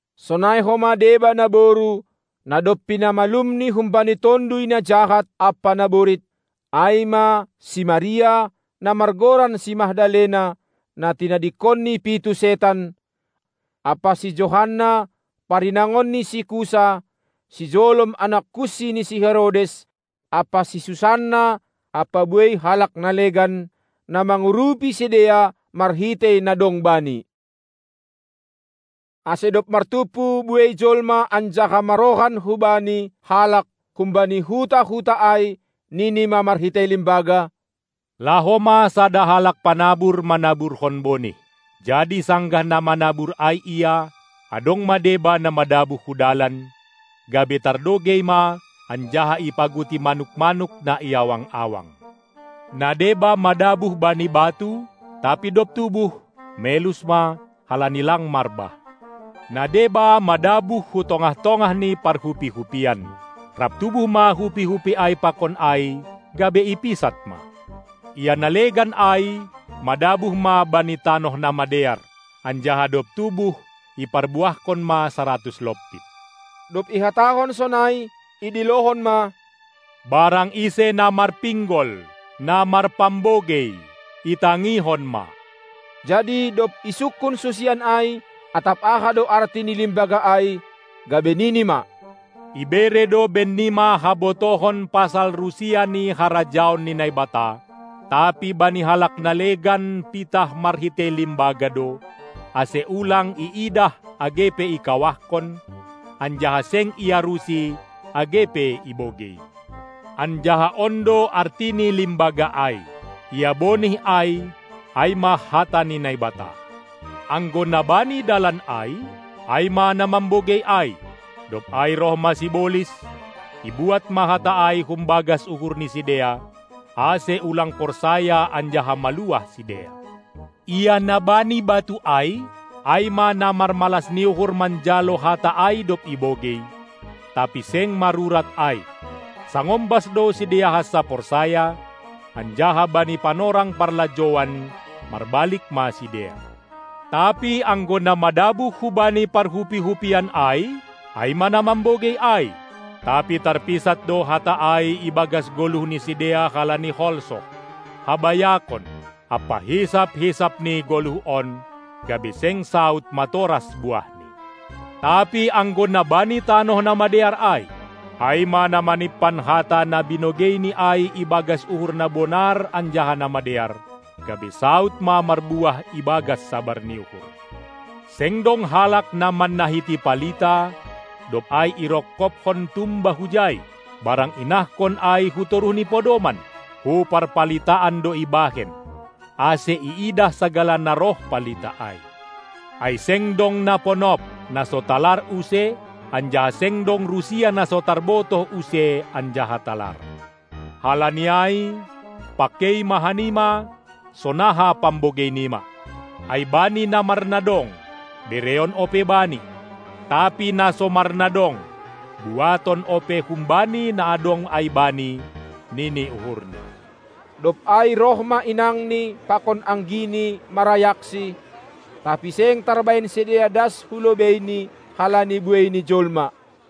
sonai homa deba naboru, na dob pinamalumNi humbani tonduy na jahat ampa naborit, ai ma si Maria, na margoran si Magdalena, na tinadingkon ni pitu setan. ampa si Johanna, parinangon ni si Kusa, sijolom anak kunsi ni si Herodes, ampa si Susanna ampa buei halak na legan, na mangurupi sidea marhitei na dong bani. Ase dob martumpu buei jolma anjaha marrohan hu Bani halak humbani huta-huta ai, nini ma marhitei limbaga: Laho ma sada halak panabur manaburhon bonih. Jadi sanggah na manabur ai ia, adong ma deba na madabuh hu dalan, gabe tardogei ma anjaha ipaguti manuk-manuk na i awang-awang. Na deba madabuh bani batu, tapi dob tubuh, melus ma, halani lang marbah. Na deba madabuh hu tongah-tongah ni parhupi-hupian; rap tubuh ma hupi-hupi ai pakon ai, gabe ipisat ma. Ia na legan ai madabuh ma bani tanoh na madear, anjaha dob tubuh iparbuahkon ma saratus lompit. Dob ihatahon sonai, idilohon ma: Barang ise na marpinggol, na marpambogei, itangihon ma! Jadi dob isungkun susian ai, atap aha do arti ni limbaga ai, gabe Nini ma: Ibere do bennima habotohon pasal rusia ni harajaon ni Naibata, tapi bani halak na legan pitah marhitei limbaga do, ase ulang iidah age pe ikawahkon, anjaha seng iarusi age pe ibogei. Anjaha on do arti ni limbaga ai: Ia bonih ai; ai ma hata ni Naibata. Anggo na bani dalan ai, ai ma na mambogei ai; dob ai roh ma sibolis, ibuat ma hata ai humbagas uhur ni sidea, ase ulang porsaya anjaha maluah sidea. Ia na bani batu ai, ai ma na marmalas ni uhur manjalo hata ai dob ibogei; tapi seng marurat ai, sangombas do sidea hansa porsaya, anjaha bani panorang parlajouan marbalik ma sidea. Tapi anggo na madabuh hubani parhupi-hupian ai, ai ma na mambogei ai; tapi tarpisat do hata ai ibagas goluh ni sidea halani holsoh, habayakon ampa hisap-hisap ni goluh on, gabe seng saud matoras buahni. Tapi anggo na bani tanoh na madear ai, ai ma na manimpan hata na binogeini ai ibagas uhur na bonar anjaha na madear, gabe saud ma marbuah ibagas sabar ni uhur. Seng dong halak na mannahiti palita, dob ai irongkobkon tumba hujai, barang inahkon ai hu toruh ni podoman; hu parpalitaan do ibahen, ase iidah sagala na roh palita ai. Ai seng dong na ponop, na so talar use; anjaha seng dong rusia na so tarbotoh use anjaha talar. Halani ai, pangkei ma hanima, sonaha pambogei nima! Ai bani na marnadong, bereon ope bani, tapi na so marnadong, buaton ope humbani na adong ai bani, nini uhurni. Dob ai roh ma inangNi pakon anggiNi marayakSi, tapi seng tarbahen sidea das hu lobeiNi halani buei ni jolma.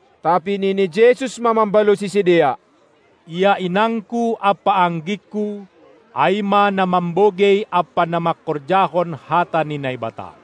Tapi nini Jesus ma mambalosi sidea: Ia inangKu ampa anggingKu, ai ma na mambogei ampa na mangkorjahon hata ni Naibata.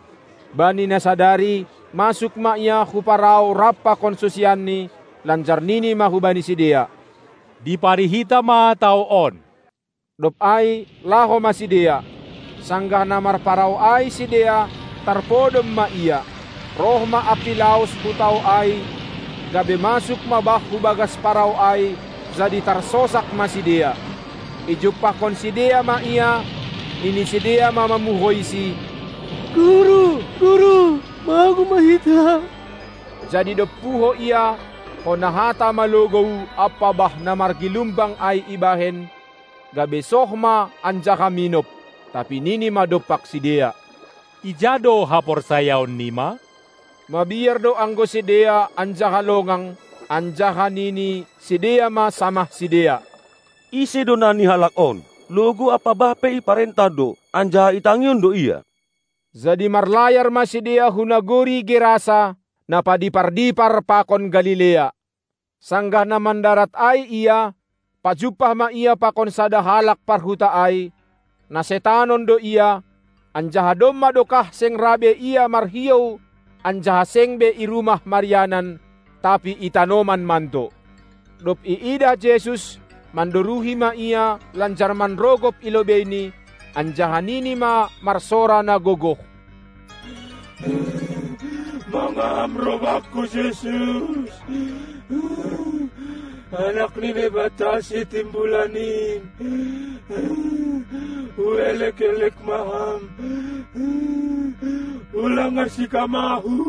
Bani na sadari masuk ma Ia hu parau rap pakon susianNi, lanjar nini ma hubani sidea: Dipari hita ma tao on! Dob ai laho ma sidea. Sanggah na marparau ai sidea, tarpodom ma Ia. Roh ma ampilaos hu tao ai, gabe masuk ma bah hubagas parau ai, jadi tarsosak ma sidea. Ijumpahkon sidea ma Ia, nini sidea ma mamuhoiSi: Guru, guru, magou ma hita. Jadi dob puho Ia, hona hata ma logou ampa bah na margilumbang ai ibahen, gabe soh ma anjaha minop. Tapi nini ma dompak sidea: Ija do haporsayaon nima? Mabiar do anggo sidea anjaha longang, anjaha nini sidea ma samah sidea: Ise do nani halak on? Logou ampa bah pe iparentah do, anjaha itangihon do Ia! Jadi marlayar ma sidea hu nagori Gerasa, na padipar-dipar pakon Galilea. Sanggah na mandarat ai Ia, pajumpah ma Ia pakon sada halak parhuta ai, na setanon do ia; anjaha domma dokah seng ra be ia marhiou anjaha seng be i rumah marianan, tapi i tanoman mando. Dob iidah Jesus, mandoruhi ma ia lanjar manrogop i lobeiNi, anjaha nini ma marsora na gogoh: Mangaha Ham roh bakku, Jesus, Anak ni Naibata Sitimbulan in huelek-elek ma Ham, ulang arsik Ham ahu!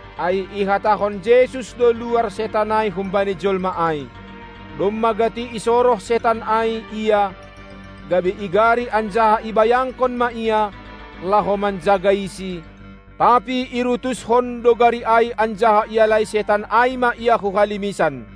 Ai ihatahon Jesus do luar setan ai humbani jolma ai. Domma gati isoroh setan ai ia, gabe igari anjaha ibayangkon ma ia, laho manjagaisi, tapi irutuskon do gari ai anjaha ialai setan ai ma ia hu halimisan.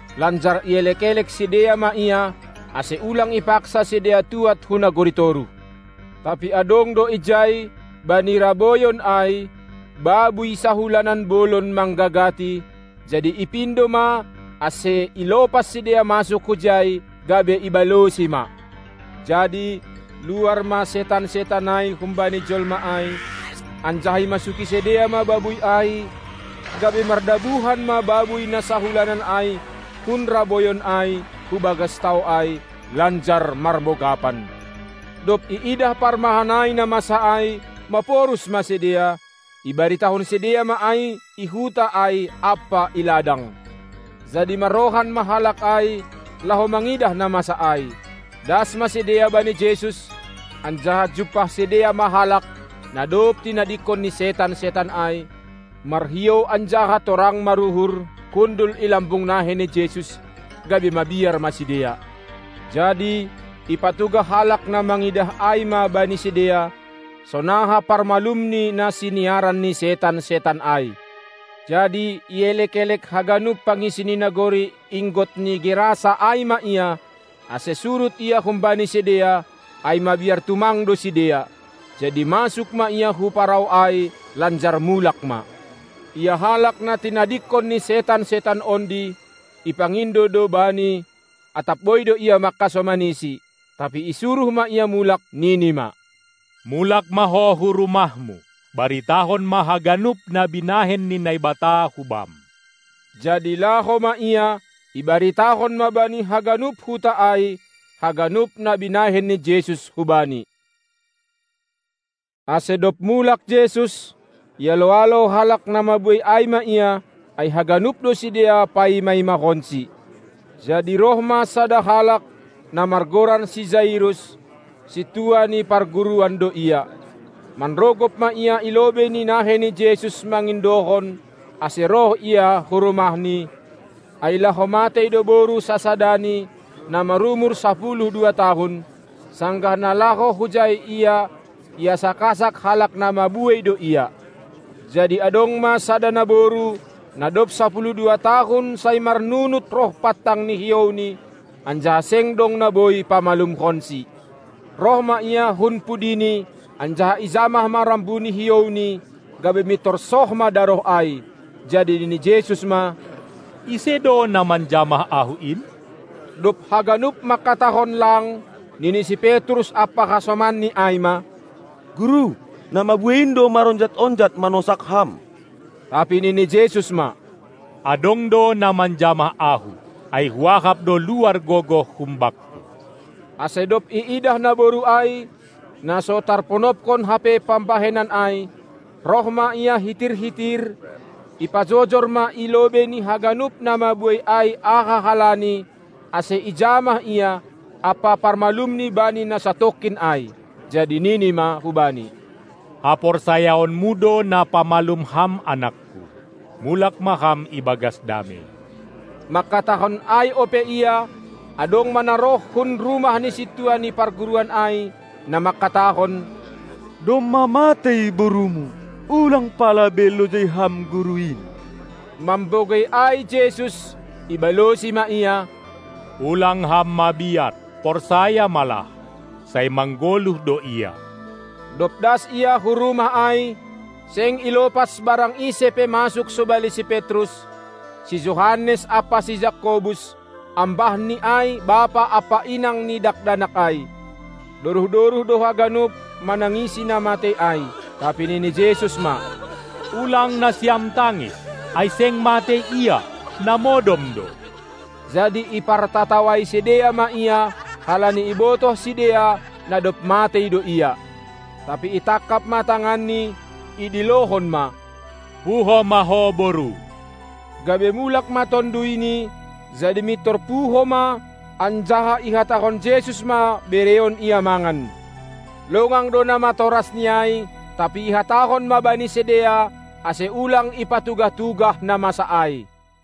Lanjar ielek-elek sidea ma Ia, ase ulang ipaksa sidea tuad hu nagori toruh. Tapi adong do ijai, bani raboyon ai, babuy sahulanan bolon manggagati; jadi ipindo ma, ase ilopas sidea masuk hujai, gabe ibalosi ma. Jadi luar ma setan-setan ai humbani jolma ai, anjaha imasuki sidea ma babuy ai, gabe mardabuhan ma babuy na sahulanan ai hun raboyon ai hubagas tao ai, lanjar marmogapan. Dob iidah parmahan ai na masa ai, maporus ma sidea, ibaritahon sidea ma ai i huta ai ampa i ladang. Jadi marrohan ma halak ai, laho mangidah na masa ai. Das ma sidea bani Jesus, anjaha jumpah sidea ma halak, na dob tinadingkon ni setan-setan ai, marhiou anjaha torang maruhur, hundul i lambung nahei ni Jesus, gabe mabiar ma sidea. Jadi ipatugah halak na mangidah ai ma bani sidea, sonaha parmalum ni na siniaran ni setan-setan ai. Jadi ielek-elek haganup pangisi ni nagori inggot ni Gerasa ai ma Ia, ase surut Ia humbani sidea, ai mabiar tumang do sidea. Jadi masuk ma Ia hu parau ai, lanjar mulak ma. Ia halak, na tinadingkon ni setan-setan ondi, ipangindo do Bani, atap boi do ia mangkasomaniSi. Tapi isuruh ma ia mulak, nini ma: Mulak ma ho hu rumahmu, baritahon ma haganup na binahen ni Naibata hu bam! Jadi laho ma ia, ibaritahon ma bani haganup huta ai, haganup na binahen ni Jesus hubani. Ase dob mulak Jesus, ialo-alo halak na mabuei ai ma Ia, ai haganup do sidea paima-imahonSi. Jadi roh ma sada halak, na margoran si Jairus; sintua ni parguruan do ia. Manrogop ma ia i lobei ni nahei ni Jesus mangindohon, ase roh Ia hu rumahni, ai laho matei do boru sasadani, na marumur sapuluh dua tahun. Sanggah na laho hujai Ia, iasak-asak halak na mabuei do Ia. Jadi adong ma sada naboru, na dob sapuluh dua tahun sai marnunut roh pantang ni hiouni, anjaha seng dong na boi pamalumhonsi. Roh ma ia hun pudini, anjaha ijamah ma rambu ni hiouNi, gabe mintor soh ma daroh ai. Jadi nini Jesus ma: Ise do, na manjamah Ahu in? Dob haganup mangkatahon lang, nini si Petrus ampa hasomanni ai ma: Guru, na mabuei in do maronjat-onjat manosak Ham! Tapi nini Jesus ma: Adong do na manjamah Ahu, ai Huahap do luar gogoh humbangKu. Ase dob iidah naboru ai, na so tarponopkon hape pambahenan ai, roh ma ia hitir-hitir, ipajojor ma i lobei ni haganup na mabuei ai aha halani, ase ijamah Ia, ampa parmalumni bani na satongkin ai. Jadi Nini ma hubani: Haporsayaonmu do na pamalum ham anakKu, mulak ma ham ibagas damei! Mangkatahon ai ope Ia, adong ma na roh hun rumah ni sintua ni parguruan ai, na mangkatahon: Domma matei borumu, ulang pala be lojai ham Guru in! Mambogei ai Jesus, ibalosi ma ia: Ulang ham mabiar, porsaya ma lah, sai manggoluh do ia. Dob das Ia hu rumah ai, seng ilopas barang ise pe masuk sobali si Petrus, si Johannes ampa si Jakobus, ambah ni ai bapa ampa inang ni dakdanak ai. Doruh-doruh do haganup manangisi na matei ai. Tapi nini Jesus ma: Ulang nasiam tangis! Ai seng matei ia, na modom do! Jadi ipartatawai sidea ma Ia, halani ibotoh sidea, na dob matei do ia. Tapi itangkap ma tanganni, idilohon ma: Puho ma ho, boru! Gabe mulak ma tonduyni, jadi mintor puho ma, anjaha ihatahon Jesus ma bereon ia mangan. Longang do namatorasni ai; tapi ihatahon ma bani sidea, ase ulang ipatugah-tugah na masa ai.